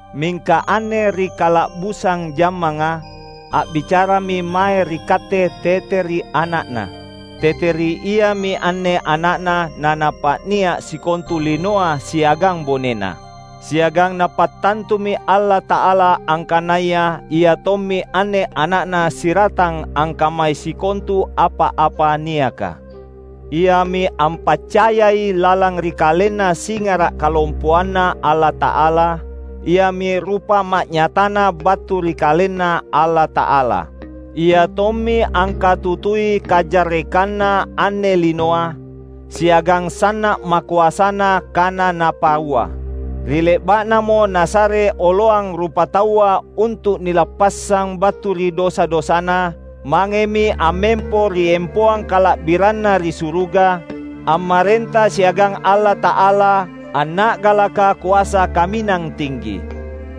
Mingka anne ri kala’busang jammanga, a’bicarami mae ri katte tete ri Ana’Na. Tete ri Iami anne Ana’Na naNapa’nia’ sikontu linoa siagang bonena. Siagang Napattantumi Allata’ala angkanaya Ia tommi anne Ana’Na siratang angkammai sikontu apa-apa niaka. Iami ampaccayai lalang ri KalenNa singara’ kalompoanNa Allata’ala; Iami rupa ma’nyataNa battu ri KalenNa Allata’ala. Iatommi angkatutui kajarrekanna anne linoa, siagang sanna’ makoasana kana Napaua. Ri le’ba’namo Nasare oloang rupataua untu’ nilappassang battu ri dosa-dosana, mangemi ammempo ri empoang kala’biranNa ri suruga, ammarenta siagang Allata’ala, anna’galaka koasa kaminang tinggi.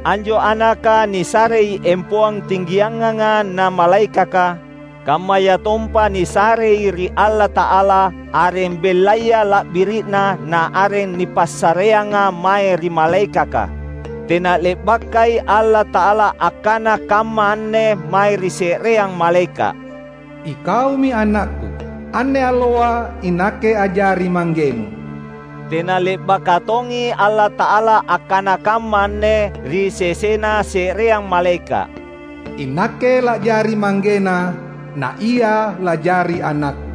Anjo Anaka nisarei empoang tinggianganga na malaekaka; kammayatompa nisarei ri Allata’ala areng bellaya la’biri’na na areng nipassareanga mae ri malaekaka. Tena le’bakai Allata’ala akkana kamma anne mae ri se’reang malaeka’, "Ikaumi AnakKu; anne alloa iNakke a’jari ManggeNu." Tena le’baka tongi Allata’ala akkana kamma anne ri sesena se’reang malaeka’, "INakke la’jari ManggeNa, na Ia la’jari AnakKu."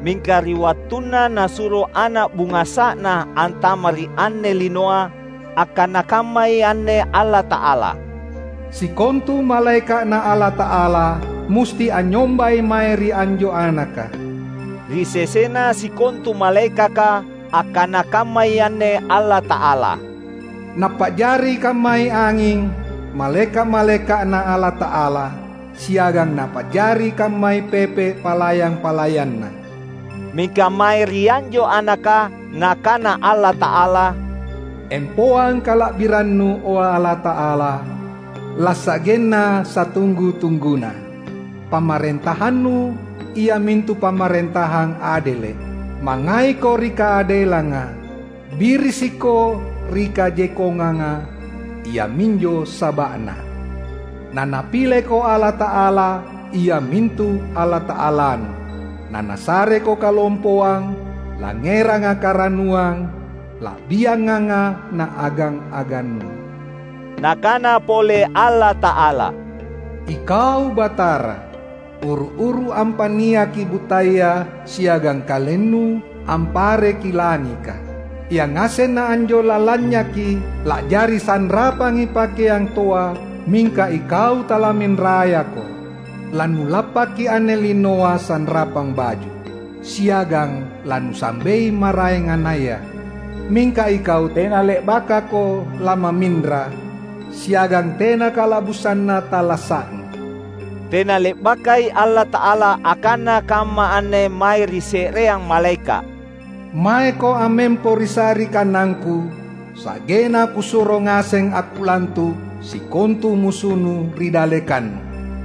Mingka ri wattunna Nasuro Ana’ bungasa’Na antama’ ri anne linoa, akkana kammai anne Allata’ala, "Sikontu malaeka’Na Allata’ala musti anynyombai mae ri anjo Anaka." Ri sesena sikontu malaekaka, akkana kammai anne Allata’ala, "Napa’jari kammai anging malaeka’-malaeka’Na Allata’ala, siagang Napa’jari kammai pepe’ palayang-palayanNa." Mingka mae ri anjo Anaka, Nakana Allata’ala, "Empoang kala’biranNu, o Allata’ala, lasa’genna satunggu-tungguna! PamarentahanNu, iamintu pamarentahang adele’. MangngaiKo ri kaadelanga, birisikKo ri kajekkonganga; iaminjo saba’na, naNapileKo Allata’ala, iamintu Allata’alaNu, na Nasareko kalompoang, langngeranga karannuang, la’bianganga na agang-aganNu." Nakana pole Allata’ala, "Ikau Batara, uru-uru ampa’niaki buttaya siagang KalenNu ampareki langika. Yangasenna anjo lalanynyaki, la’jari sanrapangi pakeang toa mingka Ikau talamminrayaKo. LaNulappaki anne linoa sanrapang baju siagang laNusambei maraengannaya. Mingka Ikau tena le’bakaKo lamamminra siagang tena kala’busanna tallasa’Nu." Tena le’bakai Allata’ala akkana kamma anne mae ri se’reang malaeka’, "Maeko ammempo ri sa’ri kanangKu, sa’genna Kusuro ngaseng akkulantu’ sikontu musunnu ri dallekannu."